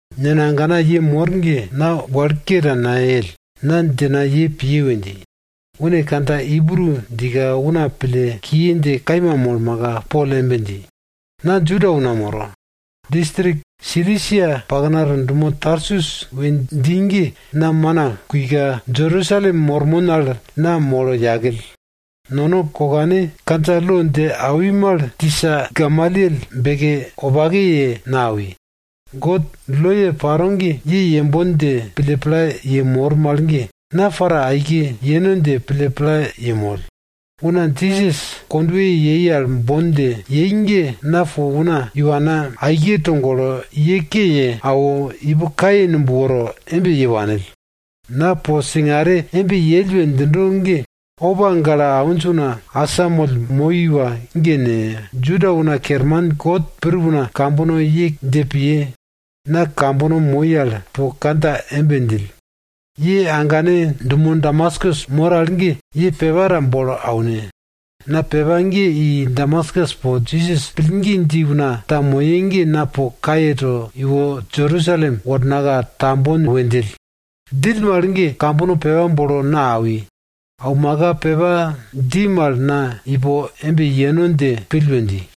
Nena agana ye mor ge, na wal ke ta nayell, na djina ye piye we dji. Une kandja Ibru djika, una pille kiye dje kaima molmaka, Pol embe dji, na Juda una moro. Distrik Silisia paknato dumo Tarsus we dji ge na mana kuika, Jerusalem mormon al na molo yakill. Nono kokane kandja lo dje awi mal tisa Gamalyel beke wopake ye na awi. God loye paro ge ye yembon dje pille pla yemor mal ge, na para aike yeno dje pille pla yemoll. Una Jisas kondweye yei al bon dje yei ge, na po una iwana aike togolo, ye ke ye awo, ipo kaye numb woro embe ye wanill. Na po singare embe yell we djindo ge opa gale awinj una asamoll moi iwa ge ne, Juda una kerman kot pir una kambono ye dje piye. Na kambono moi al po kandja embe djill, ye agane dumo Damaskus mor al ge ye pepa ta bolo aune. Na pepa ge i Damaskus po Jisas pillgi dji una ta moye ge na po kaye to iwo, Jerusalem wornaka tambon we djill. Djill mal ge kambono pepa bolo na awi. Aumaka pepa dji mal na ipo embe yeno dje pill we dji.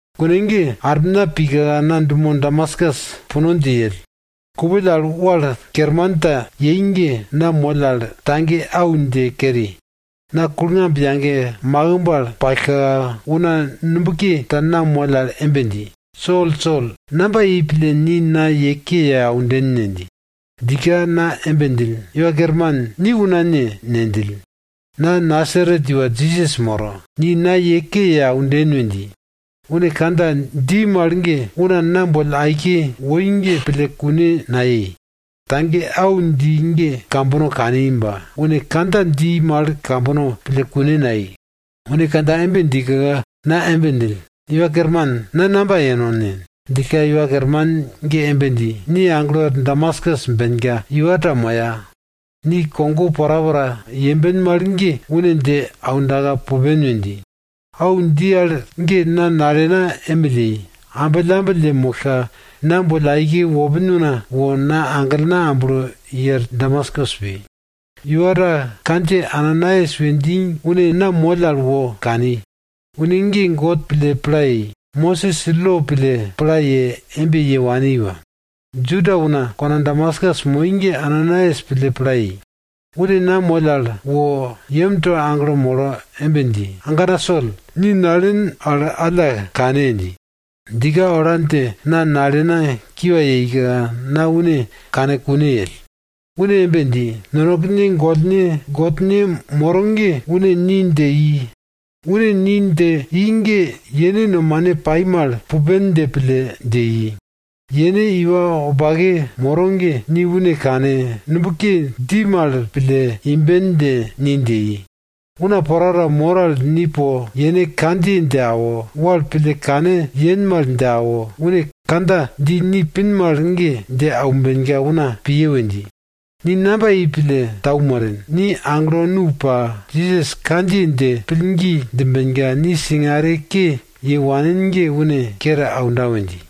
Kune ge armina pika, na dumo Damaskus puno dje yell. Kupill al wal kerman ta yei ge, na moll al tage au dje keri. Na kulngamb yage makimb al pallka, una nubke ta na moll al embe dji, Sol, Sol, namba yei pille ni na ye ke ye aunden ne? dji. Djika na embe djill, Iwa Kerman, ni una ne? ne djill. Na Nasaret iwa Jisas moro. Ni na ye ke ye aunden we dji. Une kandja dji mal ge, una na boll aike woi ge pille kune nayei. Tage au dji ge kambono kani ba une kandja dji mal kambono pille kune nayei. Une kandja embe djika, na embe djill, Iwa Kerman, na namba yeno ne? djillka Iwa Kerman ge embe dji, ni aglo er Damaskus benka, iwa ta moya. Ni kogo porapora yemben mal ge, une dje aunda pupen we dji. Au dji al ge na nalena emill yei, ambillambill yemollka, na boll aike wopin una wo na aglena amblo i er Damaskus pi. Iwa ta kandjiye Ananaias we dji une na moll al wo kani. Une ge God pille pla ye, Mosis lo pille pla ye embe ye wani iwa. Juda una kona Damaskus moi ge Ananaias pille pla yei. Une na moll al wo yemto aglo molo embe dji, agana Sol, ni nalen al alla kane! dji. Djika ola dje na nalena kiwa yeika, na une kane kune yell. Une embe dji, nonekene gollne Godne moro ge une ni dje i. Une ni dje i ge, yene nomane paro mal pille kane yemben dje pille dje i. Yene iwa wopake moro ge, ni une kane, nubke dji mal pille imben dje ni dje i. Una porapora mor al ni po yene kandjiye dje awo, wal pille kane yen mal dje awo, une kandja dji ni pin mal ge, dje aumbenka una piye we dji. Ni namba yei pille tau moren? Ni aglo nu pa, Jisas kandjiye al pillgi djimbenka, ni singare ke ye wanin ge une kere aunda we dji.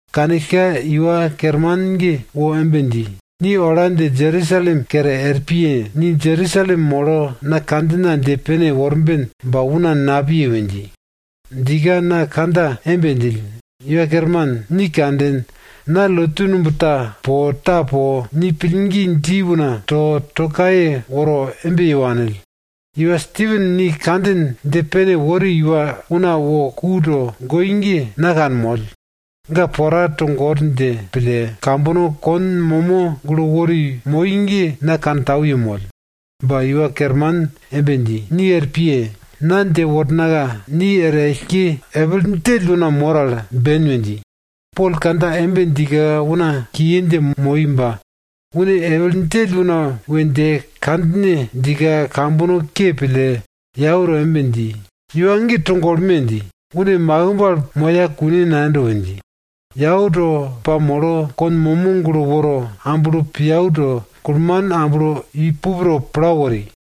Kanillka Iwa Kerman ge wo embe dji, ni ola dje Jerusalem kere er piye! Ni Jerusalem molo na kandjina dje pene worben ba una napiye we dji. Djika na kandja embe djill, Iwa Kerman, ni kanden, na lotu numb ta po ta po, ni pillgi dji una to, to kaye woro embe ye wanill. Iwa Stipen ni kandjin dje pene wori iwa una wo ku togoi ge, na kanmoll. Ga pora togor dje pille, kambono kon momo gulo wori moi ge na kantau yemoll. Ba Iwa Kerman embe dji, ni er piye! Na dje wornaka ni er ellke epil djell una mor al ben we dji. Pol kandja embe djika, una kiye dje moi ba une epil djell una we dje kandja embe djika, kambono ke pille yau to embe dji, iwa ge togolme! dji. Une makimb al moya kune nayendo we dje, yau to pamolo, kon momo gulo woro amblo piau to, kulman amblo i pup to pla wori.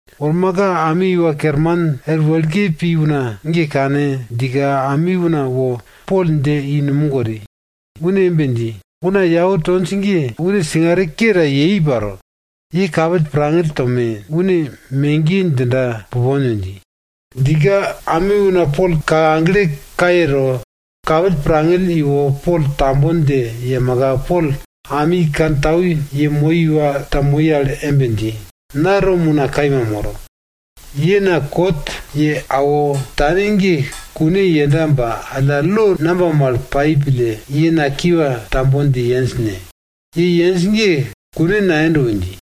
Wormaka, ami iwa kerman er wekle pi una ge kane djika, ami una wo Pol dje i numog wori. Une embe dji, una yau tonj ge, une singare ke ta yei paro, ye kapill pirngangill tome, une megiye djinda pupon we dji. Djika ami una Pol kake agle kaye to, kapill pirngangill iwo Pol tambon dje yemaka, Pol ami kantau yemoi iwa ta moi al embe dji, na Rom una kaima moro. Ye na kot ye awo tane ge kune yenda ba alla lo namba mal pai pille ye na kiwa tambon dje yenj ne? Ye yenj ge kune nayendo we dji.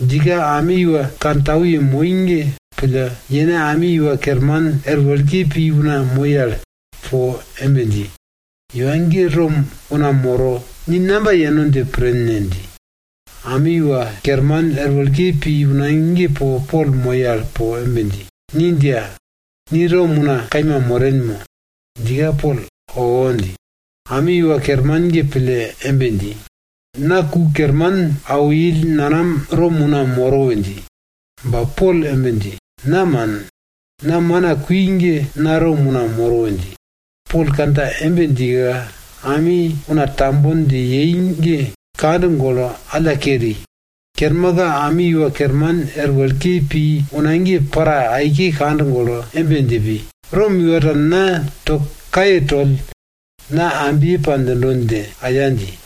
Djika ami iwa kantau yemoi ge pille, yene ami iwa kerman er wekle pi una moi al po embe dji, iwa ge Rom una moro, ni namba yeno dje pren ne? dji. Ami iwa kerman er wekle pi una ge Pol moi al po embe dji, ni djiya! Ni Rom una kaima moren mo? Djika, Pol owo dji. Ami iwa kerman ge pille embe dji, na ku kerman awo ill nanam Rom una moro we dji. Ba Pol embe dji, na man. Na mana kui ge na Rom una moro we dji. Pol kandja embe djika, ami una tambon dje yei ge kand golo alla keri. Kermaka, ami iwa kerman er wekle pi una ge para aike kand golo embe dje pi, Rom iwa ta na to kaye toll, na ambye pa djindo dje aya dji.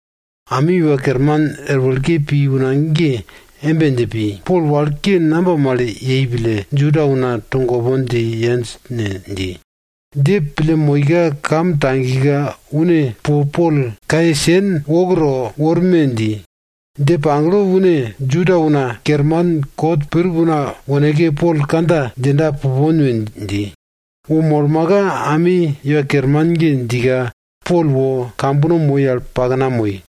Ami iwa kerman er wekle pi una ge embe dje pi, Pol wal ke namba mal yei pille, Juda una togopon dje yenj ne? dji. Dje pille moika, kam tagika une po Pol kaye sen wok to worme! dji. Dje pagle une Juda una kerman kot pir una woneke Pol kandja djinda pupon we dji. Wo molmaka ami iwa kerman ge djika, Pol wo kambono moi al pakna moi.